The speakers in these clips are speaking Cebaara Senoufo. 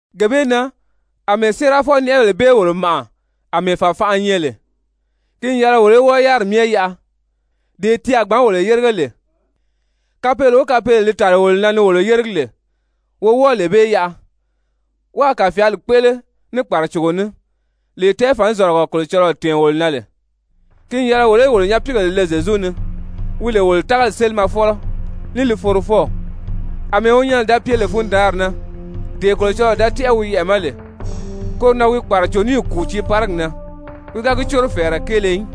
Gee bee na, àmɛɛ séerafɔ-nɛʔɛbèle bee wolo màʔa àmɛɛ fàfanʔa nyɛ lè, ki n yɛlɛ wolo í wɔ́ɔ yáriri myɛ yaʔa, dee ti a gbǎn wolo yérige lè, kapeele o kapeele li tàli wolo na ni wolo yéregi lè, wo wɔ́ɔ lee bee yaʔa, wáā kàfyaali kpéʔele ní kpàracogo ní, lee tɛɛfǎn-zɔ̀lɔgɔ Kolocɔlɔɔ tɛ̀ɛn wolo na lè. Ki n yɛlɛ wolo í wolo nyapiigèle le Zyezu ni wi lè wolo tágali sélimɛfɔlɔ ní li forofɔw. Amɛɛ wi nyɛnɛ da pye lè fundaanri na, dee Kolocɔlɔɔ da tɛ́ʔɛ wi yɛʔɛ̀ ma lè, koro na wi kpàraco níì kùu tiiparigi na, wi ga gi córo fɛ̀ɛrɛ kéele í,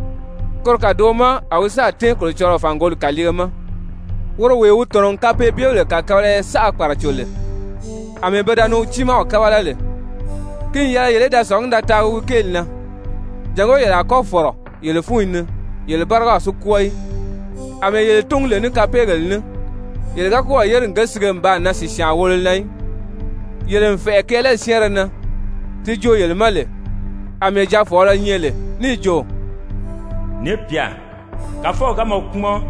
koro kàdoʔo ma a wi sáà tɛ́ɛn Kolocɔlɔɔ fàngoli kàliige ma. Woro wee wi tɔ̀nɔ n kapeebyebèle kàkabalaya saʔa kpàraco lè, àmɛɛ pe da ni wi tiimaw kábala lè, ki n yɛlɛ yele í da sɔ̀ngí da taagi wi kéeli na, jàngó yele a kɔ́ fɔ̀rɔ yele fúnyi ni yele bárigaw si kwɔ́ɔ í. Amɛɛ yele túngu lè ní kapeegèle ní, yele ga kɔ́ɔ̀ yére n ge sige n baa nan sìsyaan wolo na í. Yele n fɛ̀ʔɛ kɛɛlɛli syɛ́ɛnrɛ na, ti joo yele ma lè àmɛɛ jaafɔɔlɔ nyɛ lè níì jo: «Ni pyà, Kàfɔw ga mɔ kpúmɔn,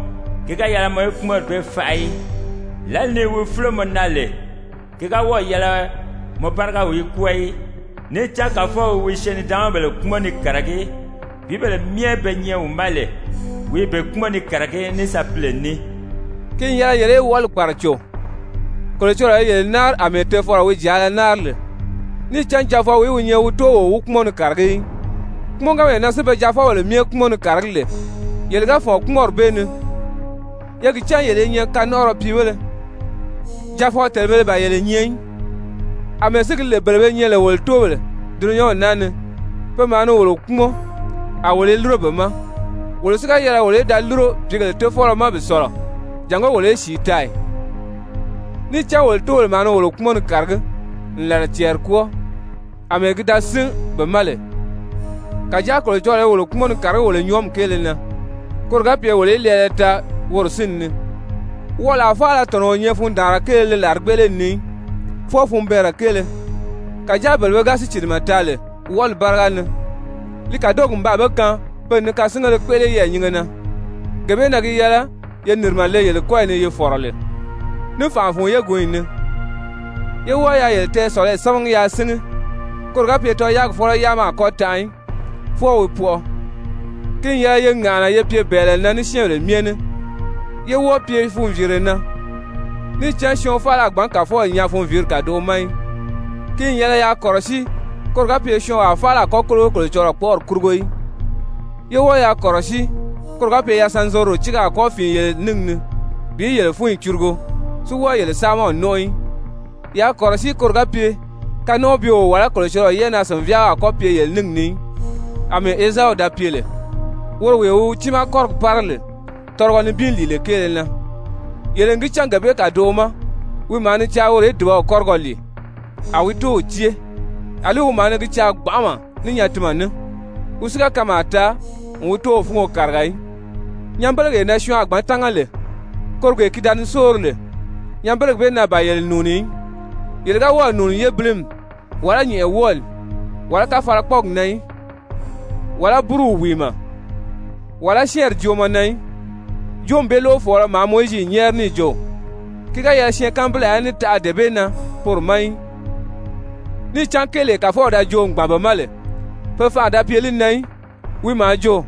ki ga yɛlɛ mɔ í kpúmɔnri bee faʔa í, lǎli ni wi fúlo mɔ na lè, ki ga wɔ́ɔ̀ yɛlɛ mɔ bárigaw í kwɔ́ɔ í. Níì cán Kàfɔw i wi syɛɛn-nidaanmabèle kpúmɔn ni kàragí, pìíbèle myɛ be nyɛ wi ma lè, wi i be kpúmɔn ni kàragí ní sapile ní.» Ki n yɛlɛ yele í wɔʔɔli kpàraco, Kolocɔlɔɔ i yele náari àmɛɛ tofɔlɔ wi jàala náari lè. Níì cán jaafɔwìí wi nyɛ wi tóow o wi kpúmɔn ni kàragí í? Kpúmɔnganmee na si be jaafɔbèle myɛ kpúmɔn ni kàragí lè, yele ga fɔ̀n kpúmɔnri bee ni, ye gi cán yele i nyɛ kanɔnʔɔrɔ piibéle, jaafɔ-tèlebēle ban yele nyɛ í. Amɛɛ si gi lè bele be nyɛ lè wolo tóobèle dulunyanw naa ni, pe maa ni wolo kpúmɔn, a wolo i lúro be ma, wolo si ga yɛlɛ wolo í da lúro pìígèle Tofɔlɔ ma bi sɔ̀lɔ jàngó wolo í sìi taa ì? Níì cán wolo tóobèle maa ni wolo kpúmɔn ni kàragí n làla cɛɛri kwɔ́ɔ, àmɛɛ ki da sín be ma lè. Kàjáa Kolocɔlɔɔ i wolo kpúmɔn ni kàragí wolo nyɔɔmi kéele na, koro ga pye wolo í lɛɛlɛ taa woro sínni ni. Wɔʔɔlaa faala tɔ̀nɔ́ o nyɛ fundaanra kéele li làrigbeʔeleli ni í, fwɔɔ funbɛɛnrɛ kéele. Kàjáa bele be ga sícilimɛ taa lè wɔʔɔli báriga ni, li kàdogi n baa be kaan pe n ni kasingéle kpéʔele yɛɛ̀nyinge na. Gee bee na gi yɛlɛ ye nìrimɛ le kɔ́yi ni yi fɔ̀rɔ lè, ní fànʔa fun yégunyi ni. Ye wɔ́ɔ yaa yele tɛɛsɔ̀lɔyi sámagi yaa síngi, koro ga pye tɔyaagi fɔ́lɔ yáama a kɔ́ tanʔa í, fwɔɔ wi pɔʔɔ. Ki n yɛlɛ ye ŋàʔana ye pye bɛ̀ɛlɛ na ní syɛ́ɛnbèle myɛ ní, yé wɔ́ɔ pye funviire na, níì cán syɔɔn faala a gbǎn Kàfɔw nyaa funviiri kàdoʔo ma í. Ki n yɛlɛ yaa kɔ̀rɔsíi koro ga pye syɔɔnwaa faala a kɔ́ kólogo Kolocɔlɔɔ kpɔ́ʔɔri kurugo í. Ye wɔ́ɔ yaa kɔ̀rɔsíi koro ga pye yasanzorodo tíige a kɔ́ fìin yele níngi ni bi yele fúnyi curugo si wɔ́ɔ yele saamaw nɔ́nʔɔ í. Yaa kɔ̀rɔsíi koro ga pye kanɔnʔɔbyeo, wàlá Kolocɔlɔɔ yɛ́ʔɛnaa-sìnvyaaɔ a kɔ́ pye yele níngi ni í, àmɛɛ Ezau da pye lè, woro wee wi wi tiimaa kɔ́rigi pára lè tɔlɔgɔ nibin lìile kéele na. Yele n gi cán gee bee kàdoʔo ma wi maa ni caa woro í dùbaw kɔ́rigɔ lìi, a wi tóow cée, àlí wi maa ni gi caa gbanʔama ní nyatinmɛ ní, wi si ga kanmaa taa n wi tóow fúngo kàriga í. Nyanbelegee na syɔɔn a gbǎn tánga lè, koro gee ki da ni sóori lè, nyanbelegi bee na ban yele nùuni í, yele ga wɔ́ɔ̀ nùuni yébilimi, wàlá nyɛ̀ʔɛwɔɔli, wàlá káfalakpɔɔgi na í, wàlá búruw wìimɛ, wàlá syɛ́ɛnri joomɔ na í, joomi bee lóʔofɔɔlɔ maa Mowizi nyɛ́ɛri níì jo, ki ga yɛlɛ syɛɛnkanbilaa í ní taʔa dee bee na poro ma í. Níì cán kéelee Kàfɔw da joo n gbàn be ma lè, pe fanʔa da pye li na í, wi maa jo: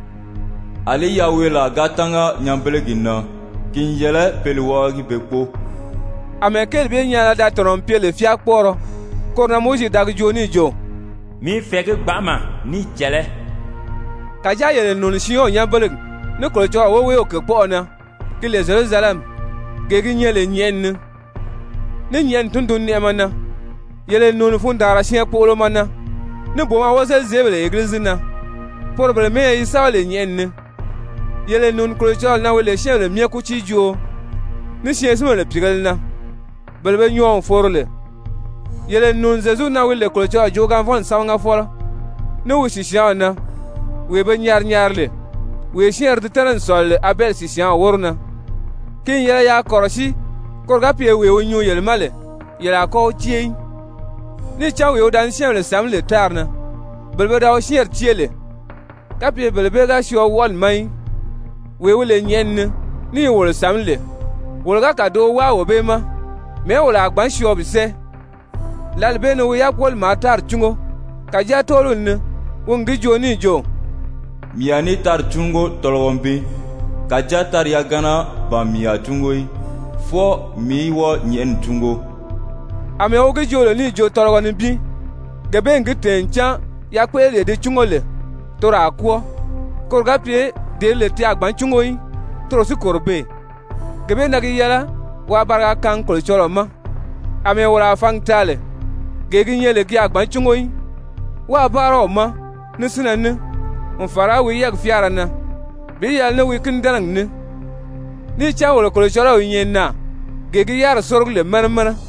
«Alí yaweelaa ga tánga nyanbelegi na, ki n yɛlɛ pe li wábagi be kpóo.» Amɛɛ kéeli bee nyaana da tɔ̀nɔ n pye lè fyáakpɔɔrɔ, koro na Mowizi da gi joo níì jo: «Mii i fɛ̀ɛgí gbanʔama ní i cɛ̀lɛ́.» Kàjáa yele n nùuni Siyɔn nyanbelegi, ní Kolocɔlɔɔ woweew kèkpɔʔɔ na ki lè Zyerusalɛmi, gee gi nyɛ lè nyɛ̀ʔɛni ni, ní nyɛ̀ʔɛni tundunnɛʔɛmɛ na. Yele n nùuni fundaanra syɛɛnkpoʔolomɔ na, ní booma wozelizeebèle Egilizi na, poro bele mɛ́ɛyɛ yi sɛ́bɛ lè nyɛ̀ʔɛni ni. Yele n nùuni Kolocɔlɔɔ na wi lè syɛ́ɛnbèle myɛ kútiijooo, ní syɛɛnsinbèle pìigēle na, bele be nyɔɔ n foro lè. Yele n nùuni Zyezu na wi lè Kolocɔlɔɔ joogaanvɔnni sámagafɔlɔ, ní wi sìsyaanw na, wee be nyari nyari lè, wee syɛ́ɛnrɛ di tɛ́nɛ n sɔ̀lɔ lè Abɛli sìsyaanw wóro na. Ki n yɛlɛ yaa kɔ̀rɔsíi koro ga pye wee wi nyuu yele ma lè, yele a kɔ́ wi cée í. Níì cán wee wi da ni syɛ́ɛnbèle sàmí lè tári na, bele pe da wi syɛ́ɛnri cée lè, kapye bele bee ga syɔɔ wɔʔɔli ma í, wee wi nyɛ lè nyɛ̀ʔɛni ni, ní i wolo sàmí lè, wolo ga kàdoʔo wáa wee bee ma, mɛ̀ɛ́ wolo a gbǎn syɔɔ bi sɛ́ɛ? Lǎli bee ni wi yákpoli maa tári cúngo, kàjáa tɔ́ɔliw ni wi n gi joo níì jo: «Mii a ní tári cúngo tɔlɔgɔ nibin, kàjáa tári yagana ban mii a cúngo í, fwɔɔ mii í wɔ́ɔ nyɛ̀ʔɛni cúngo.» Amɛɛ wi gi joo lè níì jo: «Tɔlɔgɔ nibin,» gee bee n gi tɛ̀ɛn ncan yakpéʔeleree di cúngo lè, toro a kwɔ́ɔ koro ga pye dee di nyɛ lè ti a gbǎn cúngo í, toro si kòro beè. Gee bee na gi yɛlɛ waa bariga kaangi Kolocɔlɔɔ ma, àmɛɛ wolo a fǎngi taa lè, gee gi nyɛ lè ki a gbǎn cúngo í, wáā báara wi ma ní sínnɛ ní, n fàra wi yɛ́ɛgi fyáara na, bi yɛlɛ ní wi kínidɛnɛgi ní. Níì cán wolo Kolocɔlɔw i nyɛ naà, gee gi yáriri sórogi lè mɛnɛ mɛnɛ.